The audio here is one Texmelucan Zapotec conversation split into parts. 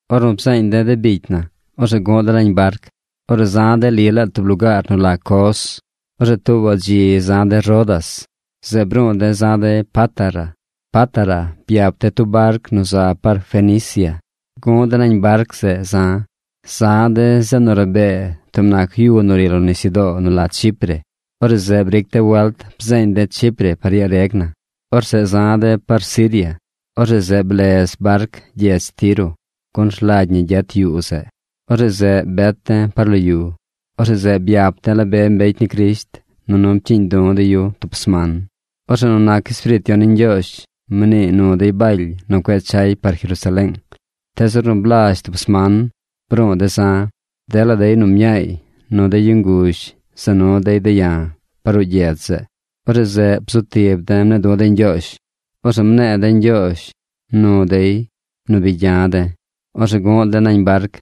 Ornu bzeeñ de̱ de bicy na, orzeꞌ gu̱ꞌ de̱ nañ barc. Orzeꞌ za̱ de̱ li laa tub lugaar nu la Cos. Orzeꞌ tuubaꞌ dzi za̱ de̱ Rodas. Zeꞌ bru̱u̱ de̱ za̱ de̱ Pátara. Pátara byap de̱ tub barc nu za par Fenicia. Gu̱ꞌ de̱ nañ barc zeꞌ za̱. Za̱ de̱ zeꞌ nu rabee tub nac yu nu ri lo nisyudoo nu la Chipre. Orzeꞌ zeꞌ briic de̱ welt bzeeñ de̱ Chipre par yaa reg na. Orzeꞌ za̱ de̱ par Siria. Orzeꞌ zeꞌ blez barc gyedz Tiro, gun rlagy ñi gyet yuu zeꞌ. Orzeꞌ zeꞌ bet de̱ par lo yu. Orzeꞌ zeꞌ byap de̱ la be mbecy ni Crisht, nunu pcyiiñ du̱ de̱ yu tub sman. Orzeꞌ nu nac Espiriit Yon ni Ñgyoozh mnii nu dey Baly nu cueꞌ chay par Jerusaleeng. Tees ornu blazh tub sman, bru̱u̱ de̱ za̱. Dela dey nu mñaay nu de yu nguzh za nu dey de̱ ya̱ par ruꞌ gyedz zeꞌ. Orzeꞌ zeꞌ bzu tib de̱ mne̱e̱ du̱ de̱ Ñgyoozh. Orzeꞌ mne̱e̱ de̱ ñgyoozh nu dey nu bi gya̱ de̱. Orzeꞌ gu̱ꞌ de̱ nañ barc.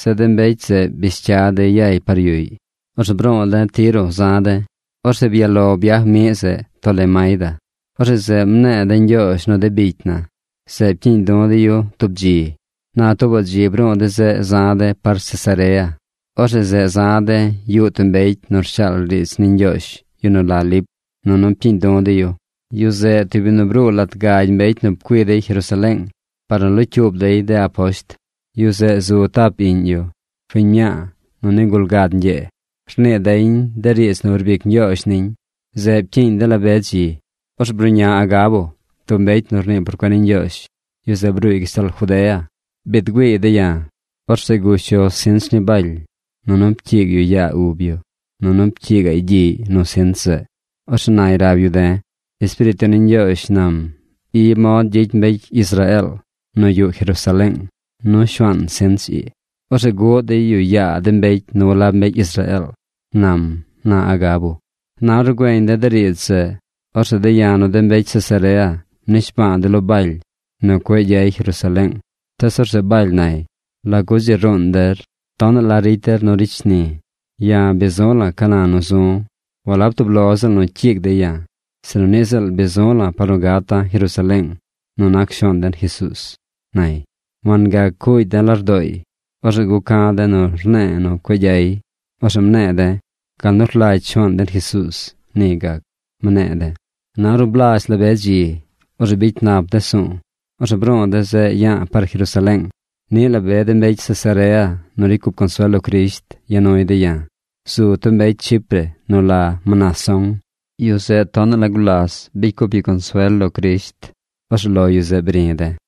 Zeꞌ de mbecy zeꞌ bish cya dey yay par yuꞌy. Orzeꞌ bru̱u̱ de̱ Tiro za̱ de̱. Orzeꞌ byaꞌ lo byaj miꞌ zeꞌ Tolemaida. Orzeꞌ zeꞌ mne̱e̱ de̱ ñgyoozh nu de bicy na. Zeꞌ pcyiiñ du̱ de̱ yu tub dzi. Na tuubaꞌ dzi bru̱u̱ de̱ zeꞌ za̱ de̱ par Cesarea. Orzeꞌ zeꞌ za̱ de̱ yuꞌ tub mbecy nu rshaal riidz ni Ñgyoozh, yu nu la Lip, nunu pcyiiñ du̱ de̱ yu. Yu zeꞌ tub yu nu bruu lat gagy mbecy nu pcui dey Jerusaleeng par nu locyuub dey de aposht. Yu zeꞌ zu tap iꞌñ yu, fiñ mñaa nu nigul gad ñgyee. Rnii deñ de riidz nu rbic Ñgyoozh niñ. Zeꞌ pcyiiñ de̱ la be dzi. Orzeꞌ bruꞌña Agabo, tub mbecy nu rnii por cuen ni Ñgyoozh. Yu zeꞌ bruuy gashtal Judea. Biid güiiy de̱ ya̱. Orzeꞌ gush yu sinch ni Baly, nunu pcyiig yu yaa ub yu, nunu pcyiigaꞌy gyiꞌy nu sinch zeꞌ. Orzeꞌ nay rab yu de̱: ―Espiriit Yon ni Ñgyoozh nam: “Ii mod gyicy mbecy Israeel nu yuꞌ Jerusaleeng nu shuaan sinch ii. Orzeꞌ guꞌ dey yu yaa de mbecy nu walab mbecy Israeel”, nam ―na Agabo. Na ornu güeñ de̱ de riidz zeꞌ, orzeꞌ de̱ ya̱ nu de mbecy Cesarea mnishba̱a̱ de̱ lo Baly nu cueꞌ gyay Jerusaleeng. Tees orzeꞌ Baly nay: ―¿Lagu dzi ruun der? Tonaꞌ la ricy der nu ricy shni̱. Ya̱ bi zu̱ la̱ ca na nu zu̱ walab tub lo ziꞌl nu cyiig dey ya̱, sinu niꞌ ziꞌl bi zu̱ la̱ par nu gata̱ Jerusaleeng nu nac Shuaan den Jesuuz ―nay. Wangac cuugy de̱ lardooy. Orzeꞌ guca̱ de̱ nu rne̱e̱ nu cueꞌ gyay. Orzeꞌ mne̱e̱ de̱: ―Gal nu rlagy Shuaan den Jesuuz, ni gac ―mne̱e̱ de̱. Na ornu blazh la be dzi, orzeꞌ bicy nap de̱ su̱u̱. Orzeꞌ bru̱u̱ de̱ zeꞌ ya̱a̱ par Jerusaleeng. Niꞌ la be de mbecy Cesarea nu ricy cup consuel lo Crisht ya nuy de̱ ya̱. Zu tub mbecy Chipre nu la Mnasón. Yu zeꞌ tonaꞌ la gulas bicy cup yu consuel lo Crisht. Orzeꞌ lo yu zeꞌ bri̱ de̱.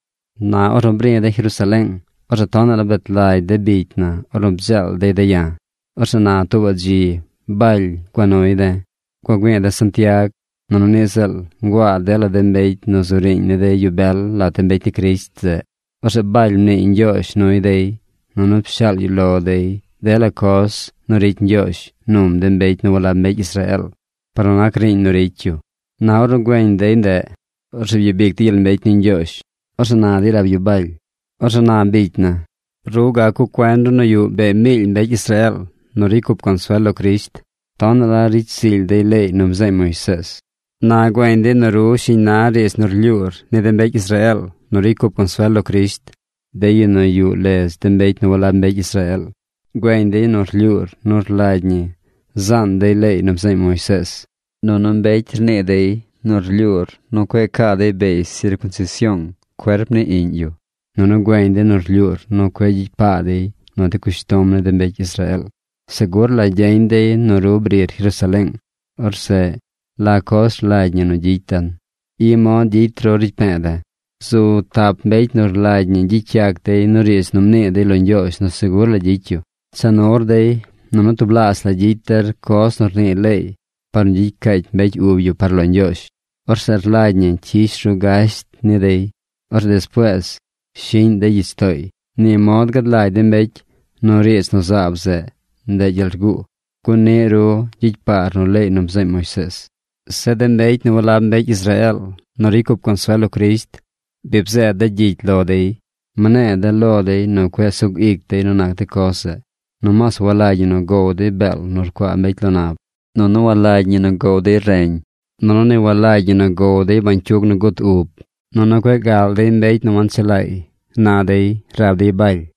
Na ornu bri̱ de̱ Jerusaleeng, orzeꞌ tonaꞌ la bet lagy de bicy na ornu bdzeel dey de̱ ya̱. Orzeꞌ na tuubaꞌ dzi Baly gua nuy de̱. Gua güi̱i̱ de̱ Santiag, nunu niꞌ ziꞌl nguaa dela de mbecy nu zu riiñ ni de yu bel lat de mbecy ni Crisht zeꞌ. Orzeꞌ Baly mniiy ñgyoozh nuy dey, nunu pshaal yu lo dey dela coz nu ricy Ñgyoozh num de mbecy nu walab mbecy Israeel par nu nac riiñ nu ricy yu. Na ornu güeñ dey ndeꞌ orzeꞌ byabic dey gyel mbecy ni Ñgyoozh. Orzeꞌ na dey rab yu Baly: ―Orzeꞌ na bicy na, ru gac cuꞌ cuen ru nu yuꞌ bee miily mbecy Israeel nu ricy cup consuel lo Crisht. Tonaꞌ la ricy zily dey leey nu bzeeñ Moisees. Na güeñ dey nu ru shiñ na riidz nu rlyuur ni de mbecy Israeel nu ricy cup consuel lo Crisht, de yu nu yuꞌ ledz de mbecy nu walab mbecy Israeel. Güeñ dey nu rlyuur nu rlagy ñi zaan dey leey nu bzeeñ Moisees. Nunu mbecy rnii dey nu rlyuur nu cueꞌ caa dey beey sircunsision cuerp ni iꞌñ yu. Nunu güeñ dey nu rlyuur nu cueꞌ gyicy paa dey nu de cushtom ni de mbecy Israeel. Segur la gyeñ dey nu ru brir Jerusaleeng. Orzeꞌ ¿la coz rlagy ñi nu gyicy den? I mod gyicy ru ricy pe̱e̱ de̱. Zu tap mbecy nu rlagy ñi gyicy yac dey nu riidz nu mnii dey lo Ñgyoozh nu segur la gyicy yu. Cha nur dey, nunu tublaazh la gyicy der coz nu rnii leey par nu gyicy caacy mbecy ub yu par lo Ñgyoozh. Orzeꞌ rlagy ñi cyish ru gasht ni dey. Orzeꞌ despuees shiꞌñ dey gyich tooy. Ni mod gad lagy de mbecy nu riidz nu zaab zeꞌ ndeꞌ gyel rguu, gun niꞌ ru gyicy paar nu leey nu bzeeñ Moisees. Zeꞌ de mbecy nu walab mbecy Israeel nu ricy cup consuel lo Crisht, bi bzeed de̱ gyicy lo dey. Mne̱e̱ de̱ lo dey nu cueꞌ sug ic dey nu nac de coz zeꞌ. Nomaas walagy ñi nu gow dey beel nu rcuaa mbecy lo nab, nunu walagy ñi nu gow dey reñ, nunu ni walagy ñi nu gow dey bañcyug nu bduzi̱i̱ yeñ, nunu cueꞌ gal dey mbecy nu wanchelaay ―na dey rab dey Baly.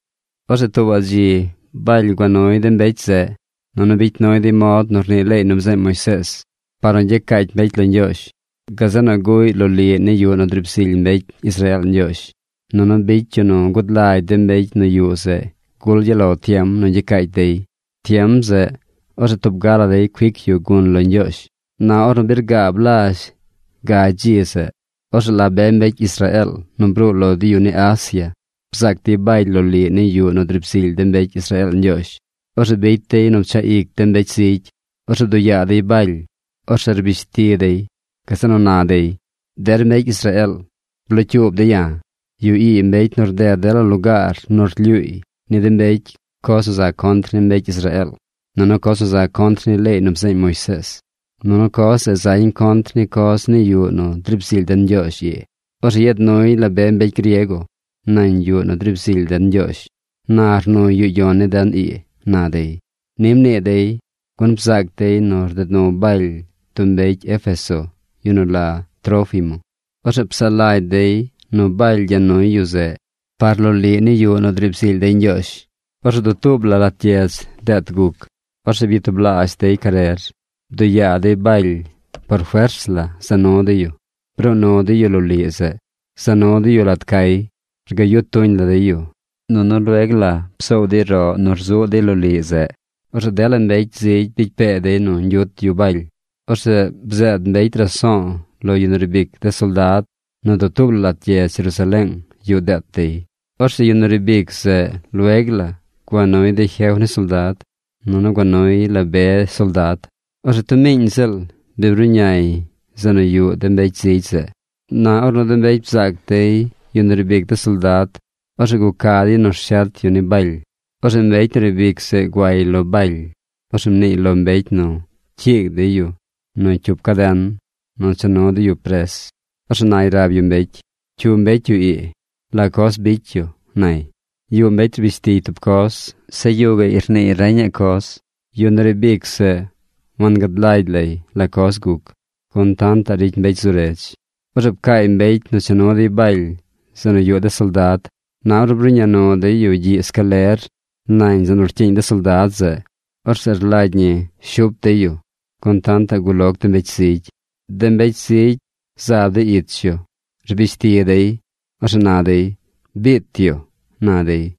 Orzeꞌ tuubaꞌ dzi Baly gua nuy de mbecy zeꞌ, nunu bicy nuy dey mod nu rnii leey nu bzeeñ Moisees par nu gyacaacy mbecy lo Ñgyoozh. Gazeꞌ nu guꞌy loliꞌ ni yuꞌ nu driib zily mbecy Israeel Ñgyoozh, nunu bicy yu nu gud lagy de mbecy nu yuꞌ zeꞌ gul gyaꞌ lo tiem nu gyacaacy dey. Tiem zeꞌ, orzeꞌ tub ga la dey cuic yu gun lo Ñgyoozh. Na ornu bi rgaab lazh gagy dzi zeꞌ, orzeꞌ la be mbecy Israeel nu bruu lo de yu ni Asia bzaac dey Baly loliꞌ ni yuꞌ nu driib zily de mbecy Israeel Ñgyoozh. Orzeꞌ bicy dey nu pchaꞌ ic de mbecy zigy. Orzeꞌ bduꞌ yaa dey Baly. Orzeꞌ rbish ti dey. Gazeꞌ nu na dey: ―¡Der mbecy Israeel, blocyuub de̱ ya̱! Yu ii mbecy nu rded dela lugaar nu rlyuuy ni de mbecy coz nu za contr ni mbecy Israeel, nunu coz nu za contr ni leey nu bzeeñ Moisees. Nunu coz zeꞌ zañ contr ni coz ni yuꞌ nu driib zily den Ñgyoozh ii. Orzeꞌ yeed nuy la be mbecy griego nañ yuꞌ nu driib zily den Ñgyoozh. Na rnuy yuꞌ yon ni den ii ―na dey. Ni mnii dey, gun bzaac dey nu rded nu Baly tub mbecy Éfeso, yu nu la Trófimo. Orzeꞌ psaꞌ lagy dey nu Baly gya nuy yu zeꞌ par loliꞌ ni yuꞌ nu driib zily dey Ñgyoozh. Orzeꞌ dutuub la lat gyedz deet guc. Orzeꞌ byatublaazh dey carer. Bduꞌ yaa dey Baly. Por fers la za nu dey yu. Bruu nu dey yu loliꞌ zeꞌ. Za nu dey yu lat cay. Rgayu tuñ la dey yu. Nunu lueg la psoow dey roꞌ nu rzuꞌ dey loliꞌ zeꞌ. Orzeꞌ dela mbecy zigy bicy pee dey nu ñgyut yu Baly. Orzeꞌ bzeed mbecy raso̱o̱ lo yu nu riib ic de soldad nu dutuub la lat gyedz Jerusaleeng yuꞌ deet dey. Orzeꞌ yu nu riib ic zeꞌ lueg la gua nuy de jef ni soldad, nunu gua nuy la be soldad. Orzeꞌ tub miiñ ziꞌl bi bruꞌñay zeꞌ nu yuꞌ de mbecy zigy zeꞌ. Na ornu de mbecy bzaac dey yu nu riib ic zeꞌ nu de soldad, orzeꞌ guca dey nu rshet yu ni Baly. Orzeꞌ mbecy nu riib ic zeꞌ guay lo Baly. Orzeꞌ mniiy lo mbecy nu cyiig dey yu nu cyup caden nu cha nu dey yu pres. Orzeꞌ nay rab yu mbecy: ―¿Cyu mbecy yu ii? ¿La coz bicy yu? ―nay. Yuꞌ mbecy rbish tiy tub coz. Zeꞌ yuꞌ gaꞌy rniiy reña coz. Yu nu riib ic zeꞌ wangad lagy lay la coz guc, gun tantaꞌ ricy mbecy zu redz. Orzeꞌ pcaay mbecy nu cha nu dey Baly zeꞌ nu yuꞌ de soldad. Na ornu bruꞌña nu dey yu gyiꞌ scaler nañ zeꞌ nu rcyiiñ de soldad zeꞌ, orzeꞌ rlagy ñi shup dey yu, gun tantaꞌ guloc de mbecy zigy. De mbecy zigy zaab dey ich yu. Rbish ti dey. Orzeꞌ na dey: ―¡Biit yu! ―na dey.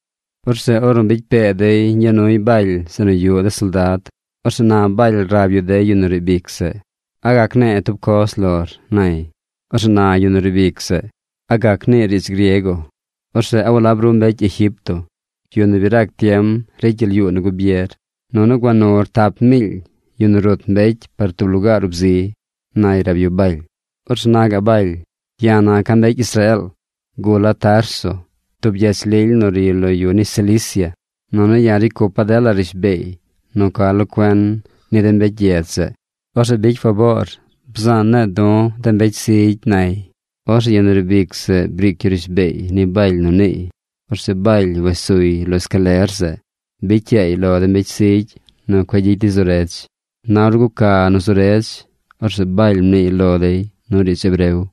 Orzeꞌ ornu bicy pee dey ñgya nuy Baly zeꞌ nu yuꞌ de soldad, orzeꞌ na Baly rab yu yu nu riib ic zeꞌ: ―¿A gac ne̱e̱ tub coz lor? ―nay. Orzeꞌ na yu nu riib ic zeꞌ: ―¿A gac niir riidz griego? Orzeꞌ ¿a walab ru mbecy Egipto, yu nu bi rac tiem ricy gyel yuu nu gubier, nunu gua nur tap miily yu nu rut mbecy par tub lugaar ub zi? ―nay rab yu Baly. Orzeꞌ na gaꞌ Baly: ―Ya̱ naca̱ mbecy Israeel. Gula̱ Tarso, tub gyedz lily nu ri lo yu ni Cilicia. Nunu ya̱ ricy cupa̱ dela rishbeey nu ca lo cuen ni de mbecy gyedz zeꞌ. Orzeꞌ bicy faboor bzaan ne̱e̱ du̱ de mbecy zigy ―nay. Orzeꞌ yu nu riib ic zeꞌ briic yu rishbeey ni Baly nu niiy. Orzeꞌ Baly wes suy lo escaler zeꞌ. Bicy yaay lo de mbecy zigy nu cueꞌ gyicy dey zu redz. Na ornu guca nu zu redz, orzeꞌ Baly mniiy lo dey nu riidz hebreo.